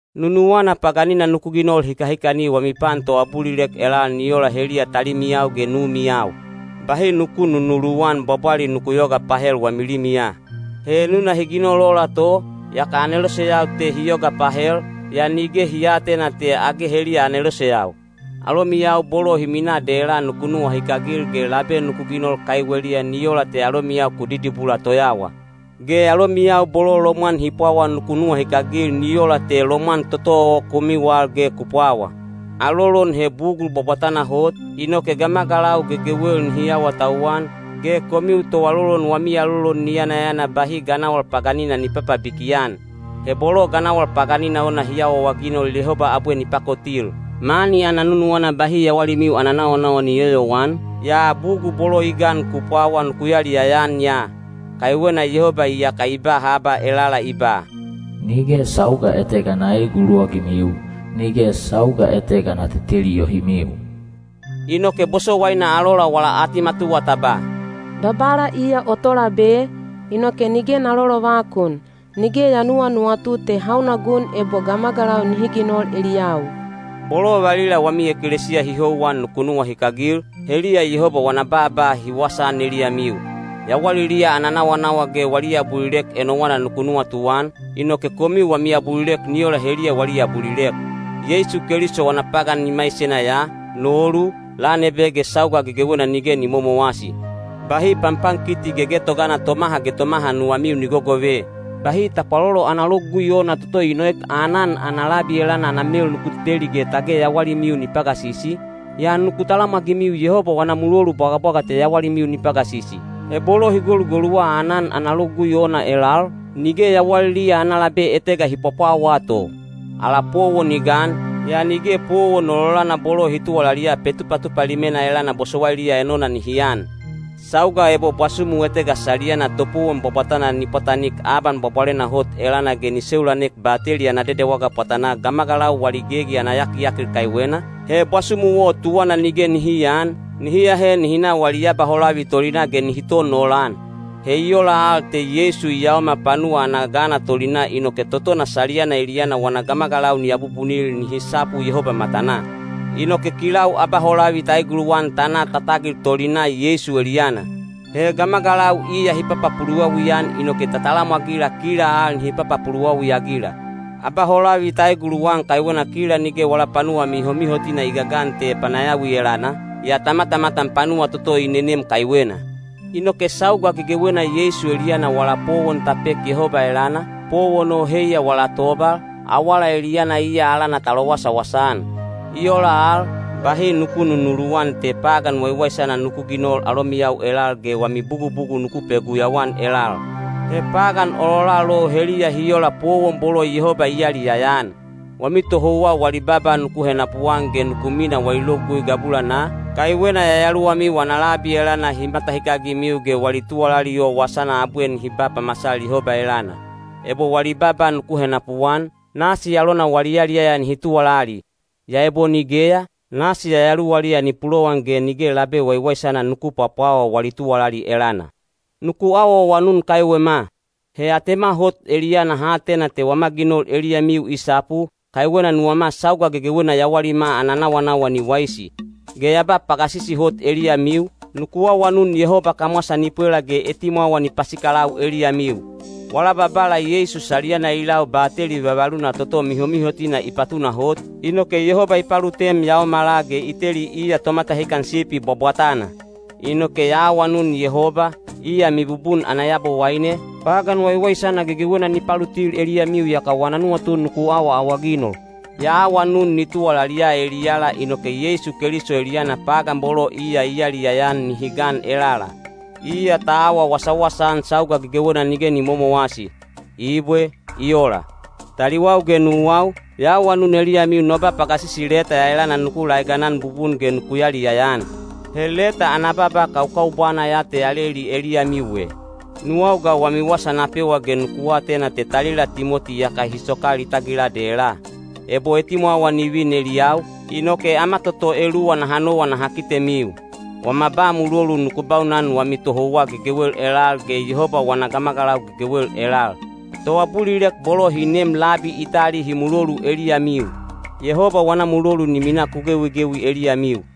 Nunuwana paganina nuku ginol hikahikani wami pan toabulilek elal ni ola heliya talimiyau ge numiyau. Bahi nuku nunuluwan bwabwali nuku yoga pahel wami limiya. He enuna hi ginol ola to, yaka aneloseyau te hi yoga pahel, yaa nige hi aatena te age heliya aneloseyau. Alomiyau bolo hi minaa dela nuku nuwahikagil ge labe nuku ginol kaiweliya ni ola te alomiyau ku didibula toyawa. Ge alomiyau bolo lomwan hi pwawa nuku nuwahikagil ni ola te lomwan toto o komiu al ge ku pwawa. Alolon he bugul bwabwatana hot, inoke gamagalau gegewel nihi awatauwan, ge komiu toalolon wami alolon ni yanayana bahi ganawal paganina ni papabiki-an. He bolo ganawal paganina ona hi awaawaginol Yehoba abwe ni pakotil. Mani ana nunuwana bahi yawalimiu ana nawanawa ni yoyowan, yaa bugul bolo i gan ku pwawa nuku yaliyaya-an ya. Kaiwena Yehoba iyaka i ba haba elala i ba: Nige sauga etega na eeguluwagimiu, nige sauga etega na teteli yohimiu. Inoke bosowaina alola wala atimatuwa ta ba: Babala iya o Tolabe, inoke nige na lolovakun. Nige ya nuwanuwatu te hauna gun ebo gamagalau nihi ginol eliyau. Bolo valila wami ekelesiya hi houwan nuku nuwahikagil, heliya Yehoba wana baaba hi wasaan eliyamiu. Yawaliliya ana nawanawa ge wali abulilek enowana nuku nuwatuan, inoke komiu wami abulilek ni ola heliya wali abulilek. Yeisu Keliso wana pagan i maisena ya, nolu, lan ebe ge sauga gegewena nige ni momowasi. Bahi panpankiti gegetogana tomaha ge tomaha nuwamiu ni gogove. Bahi tapwalolo ana logugui ona toto i noek aanan ana labi elana ana mel nuku teteli ge tage yawalimiu ni pagasisi, yaa nuku talamwagimiu Yehoba wana mulolu bwagabwaga te yawalimiu ni pagasisi. He bolo hi golugoluwa aanan ana logugui ona elal, nige yawaliliya ana labe etega hi pwapwawaa to. Ala powon i gan, yaa nige powon ololana bolo hi tuwalaliya Petupatupa Limena elana bosowailiya enona nihi an. Sauga ebo bwasumu etega saliyana topowon bwabwatana ni pwatanik Aban Bwabwalena Hot elana ge ni seulanek Bateli ana Dedewaga pwatanaa gamagalau wali gegi ana yakiyakil kaiwena, he bwasumu o tuwana nige nihi aan, nihi ahe nihi na wali abaholavi tolinaa ge nihi ton olan. He i ola al te Yeisu i yaomal panuwa ana gana tolinaa inoke totona saliyana eliyana wana gamagalau ni abubunil nihi sapu Yehoba matanaa. Inoke kilau abaholavi ta eguluwan ta na ta tagil tolinaa Yeisu eliyana. He gamagalau iya hi papapuluwawi-an inoke ta talamwagila kila al nihi papapuluwawi-agila. Abaholavi ta eguluwan kaiwena kila nige wala panuwa mihomihotina i gagan te panayawi elana, yaa ta matamatan panuwa toto i nenem kaiwena. Inoke sauga gegewena Yeisu eliyana wala powon ta pek Yehoba elana, powon o heiya wala tobal, awala eliyana iya alana ta lowasawasa-an. I ola al, bahi nuku nunuluwan te pagan waiwaisana nuku ginol alomiyau elal ge wami bugubugul nuku peguyau-an elal. He pagan ololal o heliya hi ola powon bolo Yehoba i yaliyaya-an. Wami tohouwa wali baaba nuku henapuan ge nuku minaa wali logugui gabulanaa, kaiwena yayaluwamiu ana labi elana hi matahikagimiu ge wali tuwalali o wasana abwe nihi ba pamasal Yehoba elana. Ebo wali baaba nuku henapuan, nasi alona wali yaliyaya nihi tuwalali; yaa ebo nigeya, nasi yayaluwaliya ni pulowan ge nige labe waiwaisana nuku pwapwawa wali tuwalali elana. Nuku awaawanun kaiwema. He atema hot eliyana ha atena te wama ginol eliyamiu i sapu, kaiwena nuwama sauga gegewena yawalima ana nawanawa ni waisi. Ge ya ba pagasisi hot eliyamiu, nuku awanun Yehoba kamwasa ni pwela ge etimwawa ni pasikalau eliyamiu. Wala Babala Yeisu saliyana i lau bateli vavaluna toto mihomihotina i patunahot, inoke Yehoba i palutem yaomala ge i teli iya Tomatahikan Sipi bwabwatana. Inoke ya awanun Yehoba, iya mibubun ana Yabowaine, pagan waiwaisana gegewena ni palutil eliyamiu yaka wana nuwatu nuku awaawaginol. Ya awanun ni tuwalaliya eliyala inoke Yeisu Keliso eliyana pagan bolo iya i yaliyaya-an nihi gan elala. Iya ta awa wasawasa-an sauga gegewena nige ni momowasi. Ibwe. I ola. Taliwau ge nuwau, ya awanun eliyamiu no ba pagasisi leta ya elana nuku laeganan bubun ge nuku yaliyaya-an. He leta ana baaba kaukaubwana ya te ya leli eliyamiu e. Nuwau ga wami wasa na pewa ge nuku atena te talila Timoti iyaka hi sokal i tagila dela. Ebo etimwawa ni vin eliyau, inoke ama toto eluwa naha nowa naha kitemiu. Wama ba mulolu nuku baunan wami tohouwa gegewel elal ge Yehoba wana gamagalau gegewel elal. Toabulilek bolo hi neem labi Itali hi mulolu eliyamiu. Yehoba wana mulolu ni minaa ku gewigewi eliyamiu.